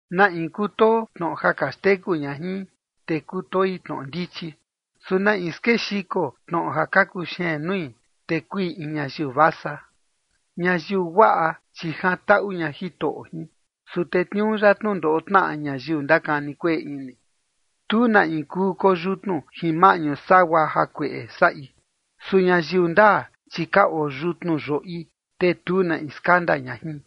Na in kutoo tnoꞌo ja ka xteku ña jin, te kutoi tnoꞌo ndichi. Su na in skexiko tnoꞌo ja ka kuxeen nui, te kui in ñayiu vasa. Ñayiu guaꞌa, chi jantaꞌu ña Jitoꞌo jin. Su tetniuu ya tnundoꞌo tnaꞌa ñayiu ndakani kueꞌe ini. Tu na in kuu koyutnu jin maꞌñu sagua jakueꞌe saꞌi. Su ñayiu ndaa, chi ka oyutnu yoꞌi, te tu na in skanda ña jin.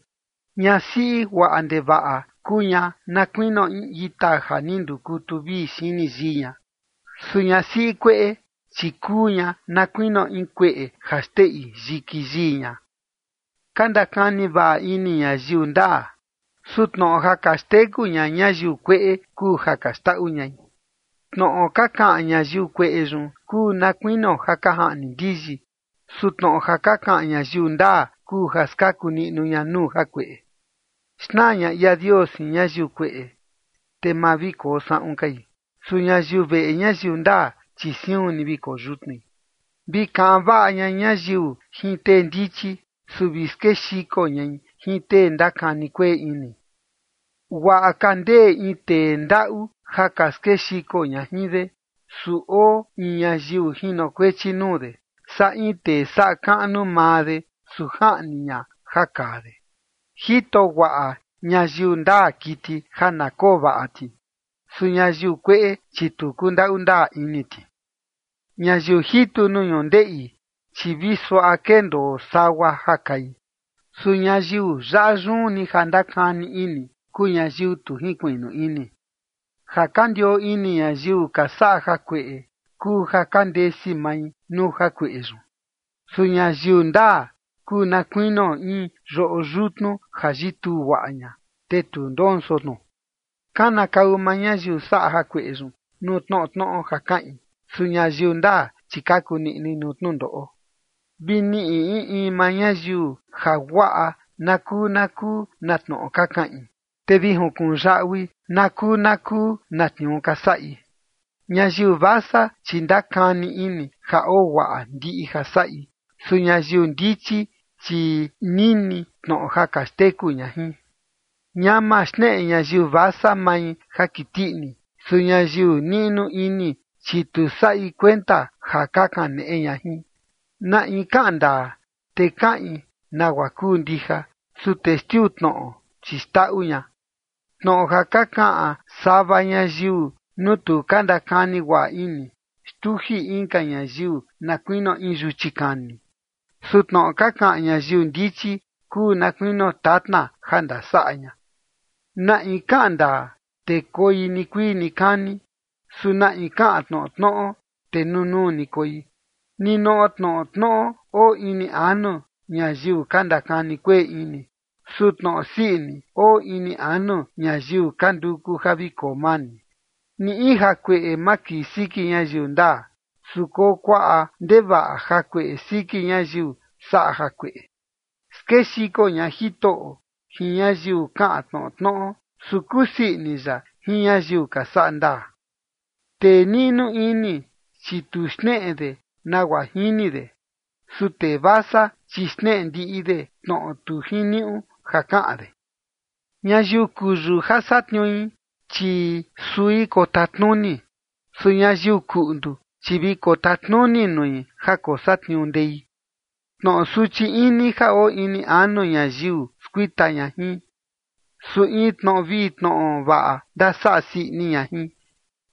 Ñasiꞌi guaꞌa ndevaꞌa kuu ña na kuinio in ita ja ni ndukutu vii xini yii ña. Su ñasiꞌi kueꞌe, chi kuu ña na kuinio in kueꞌe ja xteꞌi yiki yii ña. Ka ndakani vaꞌa ini ñayiu ndaa. Su tnoꞌo ja ka xteku ña ñayiu kueꞌe kuu ja ka xndaꞌu ñai. Tnoꞌo ka kaꞌan ñayiu kueꞌe yun kuu na kuinio ja ka jaꞌni ndiyi. Su tnoꞌo ja ka kaꞌan ñayiu ndaa kuu ja skaku ña nuu jakueꞌe. Xnaa ña ia Dios jin ñayiu kueꞌe, te ma vi koo saꞌun kai. Su ñayiu veꞌe ñayiu ndaa, chi siun ni vi koyutnui. Vi kaꞌan vaꞌa ña ñayiu jin tee ndichi. Su vi skexiko ñai jin tee ndakani kueꞌe ini. Guaꞌa ka ndee in tee ndaꞌu ja ka skexiko ña jin de, su oo in ñayiu jinokuechi nuu de, saa in tee saꞌa kaꞌnu maa de, su jaꞌni ña ja kaa de. Jito guaꞌa ñayiu ndaa kiti ja na koo vaꞌa ti. Su ñayiu kueꞌe, chi tu kundaꞌu ndaa ini ti. Ñayiu jitu nuu ñundeꞌi, chi vi suaꞌa kendoo sagua ja kai. Su ñayiu yaꞌa yun ni ja ndakani ini, kuu ñayiu tu jinkuiꞌnu ini. Ja ka ndioo ini ñayiu ka saꞌa jakueꞌe kuu ja ka ndesi mai nuu jakueꞌe yun. Su ñayiu ndaa kuu na kuinio in yoꞌo yutnu ja yituu guaꞌa ña, te tu ndonso tnu. Kanakau maa ñayiu saꞌa jakueꞌe yun nuu tnoꞌo tnoꞌo ja kaꞌin. Su ñayiu ndaa, chi kaku niꞌnui nuu tnundoꞌo. Vi niꞌi in in maa ñayiu jaguaꞌa na kuu na kuu na tnoꞌo ka kaꞌin, te vi junkuꞌun yaꞌui na kuu na kuu na tniuu ka saꞌi. Ñayiu vasa, chi ndakani ini ja oo guaꞌa ndiꞌi ja saꞌi. Su ñayiu ndichi, chi nini tnoꞌo ja ka xteku ña jin. Ñama xneꞌe ñayiu vasa mai ja kiti ini. Su ñayiu niꞌnu ini, chi tu saꞌi kuenta ja ka kaneꞌe ña jin. Na in kaꞌan ndaa, te kaꞌin nagua kuu ndija. Su testiu tnoꞌo, chi xndaꞌu ña. Tnoꞌo ja ka kaꞌan sava ñayiu nuu tu ka ndakani guaꞌa ini, xtuji inka ñayiu na kuinio in yuchi kani. Su tnoꞌo ka kaꞌan ñayiu ndichi kuu na kuinio tatna ja ndasaꞌa ña. Na in kaꞌan ndaa, te koi nikuii nikani. Su na in kaꞌan tnoꞌo tnoꞌo, te nunuu ni koi. Ninoꞌo tnoꞌo tnoꞌo oo ini anu ñayiu ka ndakani kueꞌe ini. Su tnoꞌo sii ini oo ini anu ñayiu ka nduku ja vi koo mani. Ni in jakueꞌe ma kii siki ñayiu ndaa. Su koo kuaꞌa ndevaꞌa jakueꞌe siki ñayiu saꞌa jakueꞌe. Skexiko ña Jitoꞌo jin ñayiu kaꞌan tnoꞌo tnoꞌo. Su kusii ini ya jin ñayiu ka saꞌa ndaa. Tee niꞌnu ini, chi tu xneꞌe de nagua jini de. Su tee vasa, chi xneꞌe ndiꞌi de tnoꞌo tu jiniuꞌu ja kaꞌan de. Ñayiu kuyu ja satniui, chi sui kotatnuni. Su ñayiu kuꞌndu, chi vi kotatnuni nui ja kosatniuu ndei. Tnoꞌo suchi ini ja oo ini anu ñayiu skuita ña jin. Su in tnoꞌo vii tnoꞌo vaꞌa ndasaꞌa sii ini ña jin.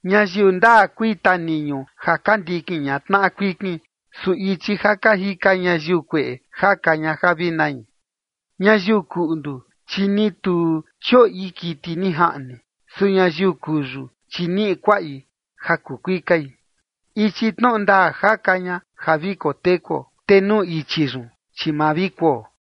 Ñayiu ndaa kui taniñu ja ka ndikin ña tnaꞌa kuikin. Su ichi ja ka jika ñayiu kueꞌe jaka ña ja vi nai. Ñayiu kuꞌndu, chi ni tu chioꞌi kiti ni jaꞌni. Su ñayiu kuyu, chi niꞌi kuaꞌi ja kuu kuikai. Ichi tnoꞌo ndaa jaka ña ja vi kotekuo, te nuu ichi yun, chi ma vi kuo.